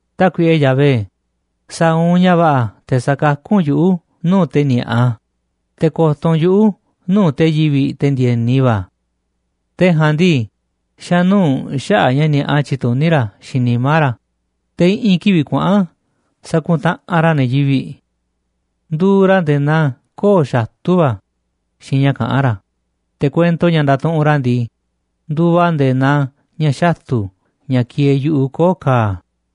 Tákuiꞌe Yahvé, sa̱a̱ u̱nꞌ ña̱ va̱ꞌa̱ te̱ sa̱kakú u̱nꞌ yuꞌu̱ nuu̱ꞌ te̱ ni̱a̱ꞌa, te̱ ko̱to̱ u̱nꞌ yuꞌu̱ nuu̱ꞌ te̱ yivi̱ꞌ, te̱ ndi̱e̱ni va̱. Te̱ ja̱a̱nꞌ ndii, xa̱nuu̱ꞌ xaꞌa̱ꞌ ña̱ ni̱a̱ꞌa tyituní ra̱ xiinꞌ nimá ra̱, te̱ i̱ꞌi̱n kivi̱ꞌ kuaꞌa̱n sakuntaꞌanꞌ ra̱ ne̱ yivi̱ꞌ. Nduuꞌ ra̱ nde̱e̱ naa koo̱ꞌ xatu̱ va̱ xiinꞌ ña̱ kaꞌán ra̱, te̱ kuento ña̱ ndatuꞌunꞌ ra̱ ndii, nduuꞌ a̱ nde̱e̱ naa ña̱ xatu̱ ña̱ kieeꞌ yu̱ꞌuꞌ koo̱ꞌ ka̱a̱.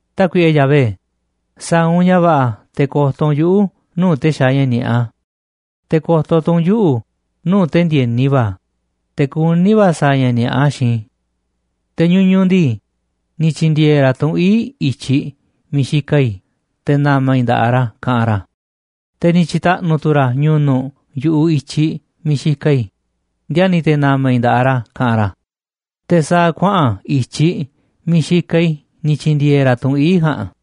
Tákuiꞌe Yahvé, sa̱a̱ u̱nꞌ ña̱ va̱ꞌa̱ te̱ ko̱to̱ u̱nꞌ yuꞌu̱ nuu̱ꞌ te̱ xaaꞌ ña̱ ni̱a̱ꞌa, te̱ ko̱to̱ tu̱ u̱nꞌ yuꞌu̱ nuu̱ꞌ te̱ ndi̱e̱ni va̱, te̱ kuní va̱ sa̱a̱ ña̱ ni̱a̱ꞌa xiinꞌ i̱. Te̱ ñuñuꞌ ndii, ni̱ tyi̱ndi̱e̱e̱ ra̱ tunꞌ ii̱ꞌ i̱tyiꞌ miiꞌ xikaꞌ i̱ te̱ na̱ma̱ i̱ nda̱ꞌaꞌ ra̱, kaꞌanꞌ ra̱, te̱ ni̱ tyi̱ta̱ꞌnu̱ tu̱ ra̱ ñu̱nu̱ꞌ yu̱ꞌuꞌ i̱tyiꞌ miiꞌ xikaꞌ i̱, ndiani̱ te̱ na̱ma̱ i̱ nda̱ꞌaꞌ ra̱, kaꞌanꞌ ra̱, te̱ sa̱a̱ kuaꞌa̱n i̱tyiꞌ miiꞌ xikaꞌ i̱ ni̱ tyi̱ndi̱e̱e̱ ra̱ tunꞌ ii̱ꞌ ja̱a̱nꞌ.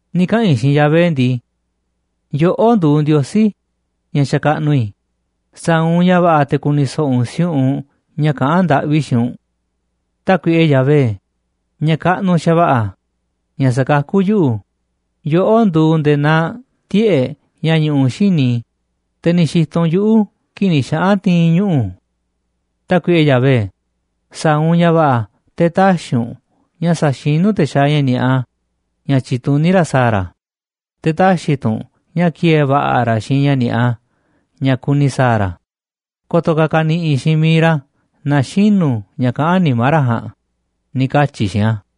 Ni̱ kaꞌa̱n i̱ xiinꞌ Yahvé ndii: “Yoꞌó nduuꞌ Ndiosí ña̱ xakaꞌnuꞌ i̱, sa̱a̱ u̱nꞌ ña̱ va̱ꞌa̱ te̱ ku̱ni̱ so̱ꞌo̱ u̱nꞌ si̱u̱ꞌunꞌ ña̱ kaꞌán ndaꞌvi i̱ xiinꞌ u̱nꞌ. Tákuiꞌe Yahvé, ña̱ kaꞌnuꞌ xa̱va̱ꞌa̱, ña̱ sa̱kakú yuꞌu̱, yoꞌó nduuꞌ nde̱e̱ naa tiꞌe̱ꞌ ña̱ ñuꞌuꞌ xíniꞌ i̱, te̱ ni̱ xi̱to̱ u̱nꞌ yuꞌu̱ kii̱ꞌ ni̱ xaꞌa̱n ti̱i̱n i̱ ñuꞌu̱. Tákuiꞌe Yahvé, sa̱a̱ u̱nꞌ ña̱ va̱ꞌa̱ te̱ tä̱xi̱ u̱nꞌ ña̱ sa̱xinú te̱ xaaꞌ ña̱ ni̱a̱ꞌa ña̱ tyituní ra̱ sa̱a̱ ra̱, te̱ tä̱xi̱ tu̱ u̱nꞌ ña̱ ki̱e̱e̱ va̱ꞌa̱ ra̱ xiinꞌ ña̱ ni̱a̱ꞌa ña̱ kuni sa̱a̱ ra̱, ko̱to̱ ka̱ ka̱ni̱ꞌi̱ xiinꞌ miiꞌ ra̱ naaꞌ xinu̱ ña̱ kaꞌán nimá ra̱ ja̱a̱nꞌ”, ni̱ katyi̱ i̱ xiinꞌ a̱.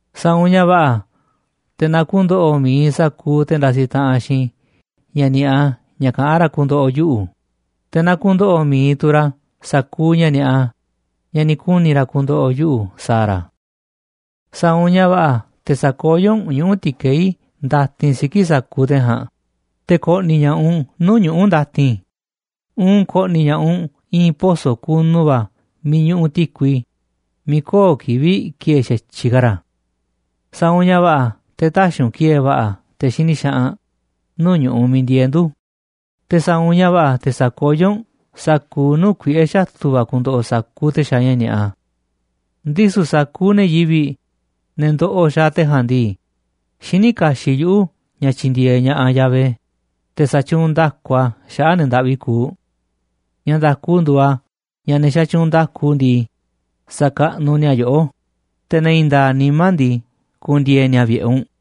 Sa̱a̱ u̱nꞌ ña̱ va̱ꞌa̱ te̱ na ku̱ndo̱ꞌo̱ mi̱iꞌ sa̱kuuꞌ te̱ ndasiꞌ taꞌanꞌ xiinꞌ i̱ ña̱ ni̱a̱ꞌa ña̱ kaꞌán ra̱ ku̱ndo̱ꞌo̱ yuꞌu̱, te̱ na ku̱ndo̱ꞌo̱ mi̱iꞌ tu̱ ra̱ sa̱kuuꞌ ña̱ ni̱a̱ꞌa ña̱ ni̱ kuni̱ ra̱ ku̱ndo̱ꞌo̱ yuꞌu̱ sa̱a̱ ra̱. Sa̱a̱ u̱nꞌ ña̱ va̱ꞌa̱ te̱ sa̱koyó u̱nꞌ ñuꞌu̱ ti̱keí ndatin siki̱ꞌ sa̱kuuꞌ te̱ ja̱a̱nꞌ, te̱ ko̱ꞌni̱ ña̱ꞌaꞌ u̱nꞌ nuu̱ꞌ ñuꞌu̱ ndatin, uun ko̱ꞌni̱ ña̱ꞌaꞌ u̱nꞌ i̱i̱n poso̱ kunu va̱ miiꞌ ñuꞌuꞌ ti̱kui, miiꞌ köo̱ꞌ kivi̱ꞌ ki̱e̱e̱ xa̱tyiꞌ ka̱ ra̱. Sa̱a̱ u̱nꞌ ña̱ va̱ꞌa̱ te̱ tä̱xi̱ u̱nꞌ ki̱e̱e̱ va̱ꞌa̱ te̱ xini xaꞌanꞌ nuu̱ꞌ ñu̱ꞌuꞌ miiꞌ ndieeꞌ ndu̱, te̱ sa̱a̱ u̱nꞌ ña̱ va̱ꞌa̱ te̱ sa̱koyó u̱nꞌ sa̱kuuꞌ nuu̱ꞌ kuiꞌe̱ xatu̱ va̱ ku̱ndo̱ꞌo̱ sa̱kuuꞌ te̱ xaaꞌ ña̱ ni̱a̱ꞌa. Ndisu̱ sa̱kuuꞌ ne̱ yivi̱ꞌ, ne̱ ndoꞌoꞌ xaaꞌ te̱ ja̱a̱nꞌ ndii, xiní kaxiꞌ yuꞌu̱ ña̱ tyi̱ndi̱e̱eꞌ ña̱ꞌaꞌ Yahvé, te̱ sa̱tyuunꞌ nda̱ku a̱ xaꞌa̱ꞌ ne̱ ndaꞌvi kuuꞌ. Ña̱ nda̱ku nduuꞌ a̱ ña̱ ne̱ xatyuunꞌ nda̱ku ndii, sa̱kaꞌnuꞌ ni̱a̱ yoꞌó, te̱ ne̱ i̱i̱n nda̱a̱ꞌ nimá ndii, ku̱ndi̱e̱e̱ ni̱a̱ vi̱ꞌe̱ u̱nꞌ.